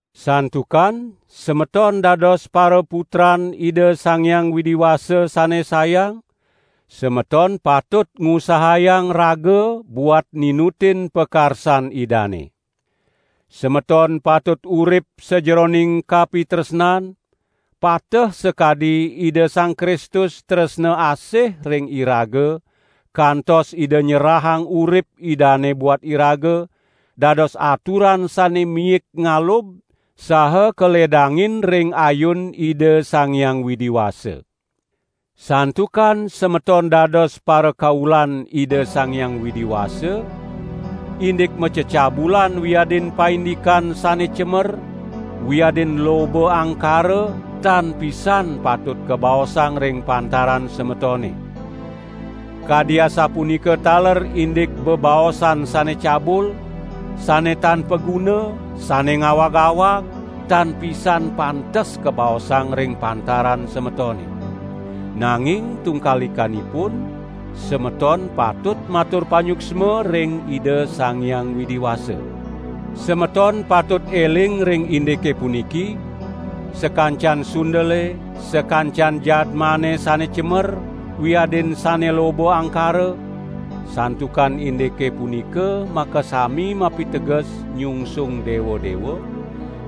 Santukan semeton dados paraputran Ida Sang Hyang Widi Wasa sane sayang, semeton patut ngusahayang raga buat ninutin pakarsan Idane. Semeton patut urip sajeroning kapitresnan, pateh sakadi Ida Sang Kristus tresna asih ring iraga kantos Ida nyerahang urip Idane buat iraga, dados aturan sane miik ngalub saha kaledangin ring ayun Ida Sang Hyang Widi Wasa. Santukan semeton dados parakaulan Ida Sang Hyang Widi Wasa, indik macecabulan wiadin paindikan sane cemer wiadin loba angkara tan pisan patut kabaosang ring pantaran semetone. Kadi asapunika taler indik bebaosan sane cabul, sane tan paguna, sane ngawag-awag, tan pisan pantes kabaosang ring pantaran semetone. Nanging tungkalikanipun, semeton patut matur panyuksma ring Ida Sang Hyang Widi Wasa. Semeton patut eling ring indike puniki: Sakancan sundele, sakancan jadmane sane cemer, wiadin sane loba angkara (santukan indike punika makasami mapiteges nyungsung dewa-dewa)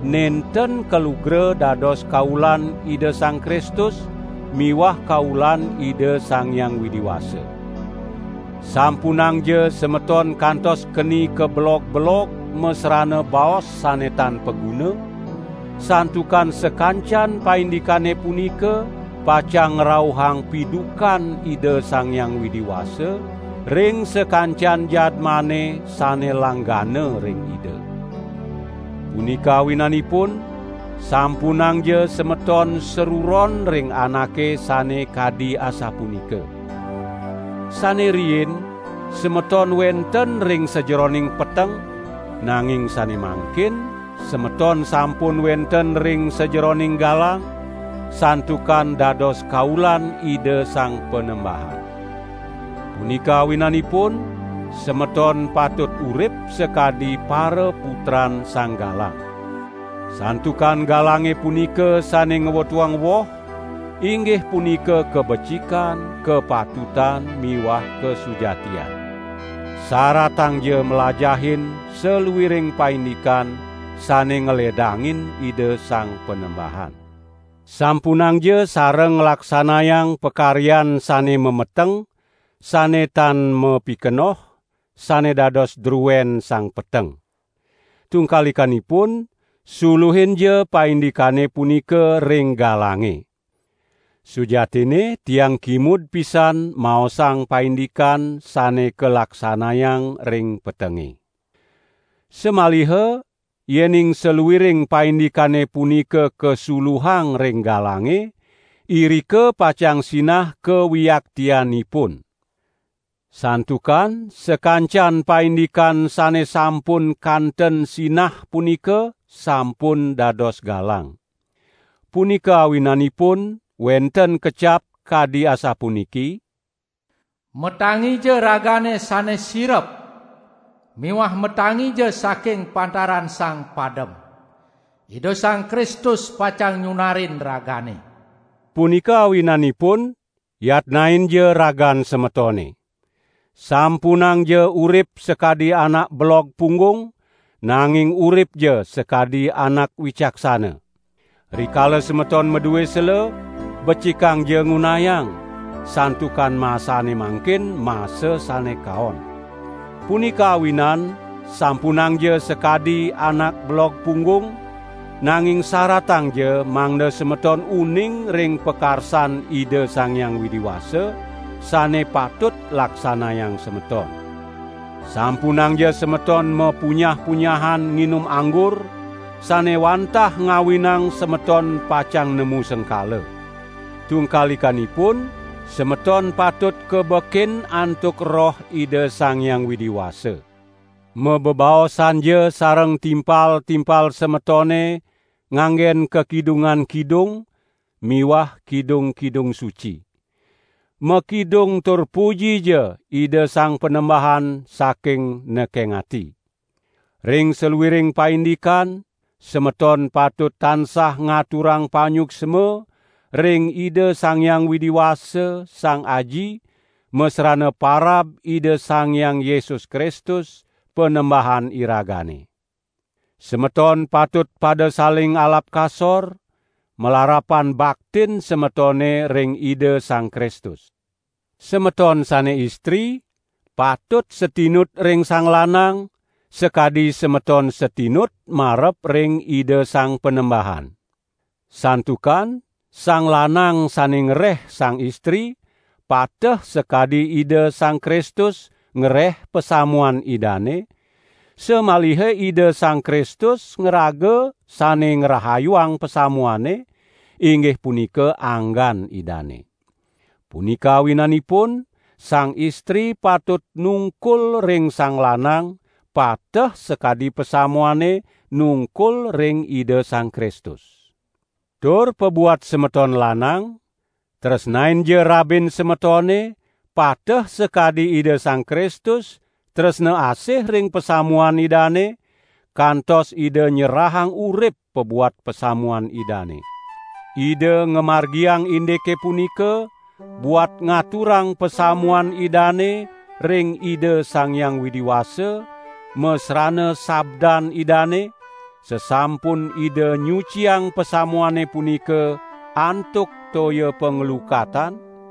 nenten kalugra dados kaulan Ida Sang Kristus miwah kaulan Ida Sang Hyang Widi Wasa. Sampunangja semeton kantos keni kabelog-belog masrana baos sane tan paguna, santukan sakancan paindikane punika pacang ngrauhang pidukan Ida Sang Hyang Widi Wasa, ring sakancan jadmane sane langgana ring Ida. Punika awinanipun, sampunangja semeton sruron ring anake sane kadi asapunika. Sane riin semeton wenten ring sajeroning peteng, nanging sane mangkin semeton sampun wenten ring sajeroning galang, santukan dados kaulan Ida Sang Panembahan. Punika awinanipun semeton patut urip sakadi paraputran Sang Galang. Santukan galange punika sane ngwetuang woh, inggih punika kabecikan, kapatutan miwah kasujatian. Saratangja mlajahin saluiring paindikan sane ngledangin Ida Sang Panembahan. Sampunangja sareng nglaksanayang pakaryan sane mameteng, sane tan mapikenoh, sane dados druen sang peteng. Tungkalikanipun, suluhinja paindikane punika ring galange. ( Sujatinne tiang kimud pisan maosang paindikan sane kalaksanayang ring petenge.) Samaliha yening saluiring paindikane punika kasuluhang ring galange, irika pacang sinah kawiaktianipun. Santukan sakancan paindikan sane sampun kanten sinah punika sampun dados galang. Punika awinanipun wenten kecap kadi asapuniki: "Matangija ragane sane sirep miwah matangija saking pantaran sang padem! Ida Sang Kristus pacang nyunarin ragane." Punika awinanipun, yatnainja ragan semetone. Sampunangja urip sakadi anak belog punggung, nanging uripja sakadi anak wicaksana. Rikala semeton madue sela, becikangja ngunayang, santukan masane mangkin masa sane kaon. Punika awinan sampunangja sakadi anak belog punggung, nanging saratangja mangda semeton uning ring pakarsan Ida Sang Hyang Widi Wasa, sane patut laksanayang semeton. Sampunangja semeton mapunyah-punyahan nginum anggur, sane wantah ngawinang semeton pacang nemu sengkala. Tungkalikanipun, semeton patut kabekin antuk Roh Ida Sang Hyang Widi Wasa. Mabebaosanja sareng timpal-timpal semetone nganggen kakidungan Kidung miwah kidung-kidung suci. Makidung tur pujija Ida Sang Panembahan saking nekeng ati. Ring saluiring paindikan semeton patut tansah ngaturang panyuksma ring Ida Sang Hyang Widi Wasa, Sang Aji, masrana parab Ida Sang Hyang Yesus Kristus, Panembahan iragane. Semeton patut pada saling alap kasor, malarapan baktin semetone ring Ida Sang Kristus. Semeton sane istri patut satinut ring sang lanang, sakadi semeton satinut marep ring Ida Sang Panembahan. Santukan sang lanang sane ngreh sang istri, pateh sakadi Ida Sang Kristus ngreh pasamuan Idane; samaliha Ida Sang Kristus ngraga sane ngrahayuang pasamuane, inggih punika anggan Idane. Punika awinanipun sang istri patut nungkul ring sang lanang, pateh sakadi pasamuane nungkul ring Ida Sang Kristus. Tur pabuat semeton lanang, tresnainja rabin semetone pateh sakadi Ida Sang Kristus tresna asih ring pasamuan Idane, kantos Ida nyerahang urip pabuat pasamuan Idane. Ida ngamargiang indike punika, buat ngaturang pasamuan Idane ring Ida Sang Hyang Widi Wasa, masrana sabdan Idane, sasampun Ida nyuciang pasamuane punika antuk toya panglukatan,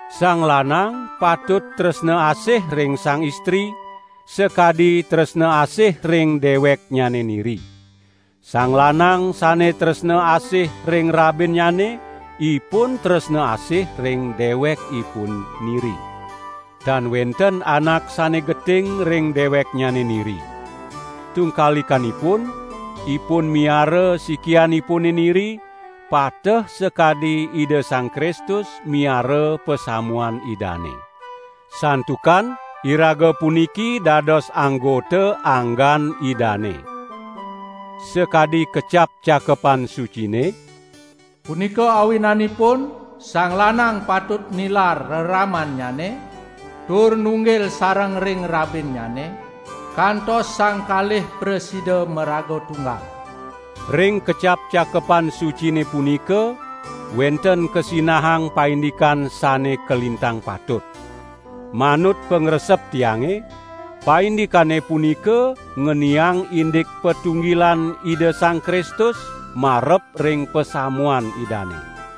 Sang lanang patut tresna asih ring sang istri, sakadi tresna asih ring deweknyane niri. Sang lanang sane tresna asih ring rabinnyane, ipun tresna asih ring dewekipun niri. ( Tan wenten anak sane geting ring deweknyane niri. Tungkalikanipun: Ipun miara sikianipune niri, pateh sakadi Ida Sang Kristus miara pasamuan Idane. Santukan iraga puniki dados anggota anggan Idane.) Sakadi kecap Cakepan Sucine: "Punika awinanipun, sang lanang patut nilar reramannyane tur nunggil sareng ring rabinnyane kantos sang kalih prasida maraga tunggal." Ring kecap Cakepan Sucine punika wenten kasinahang paindikan sane kalintang patut. Manut pangresep tiange, paindikane punika ngeniang indik patunggilan Ida Sang Kristus marep ring pasamuan Idane.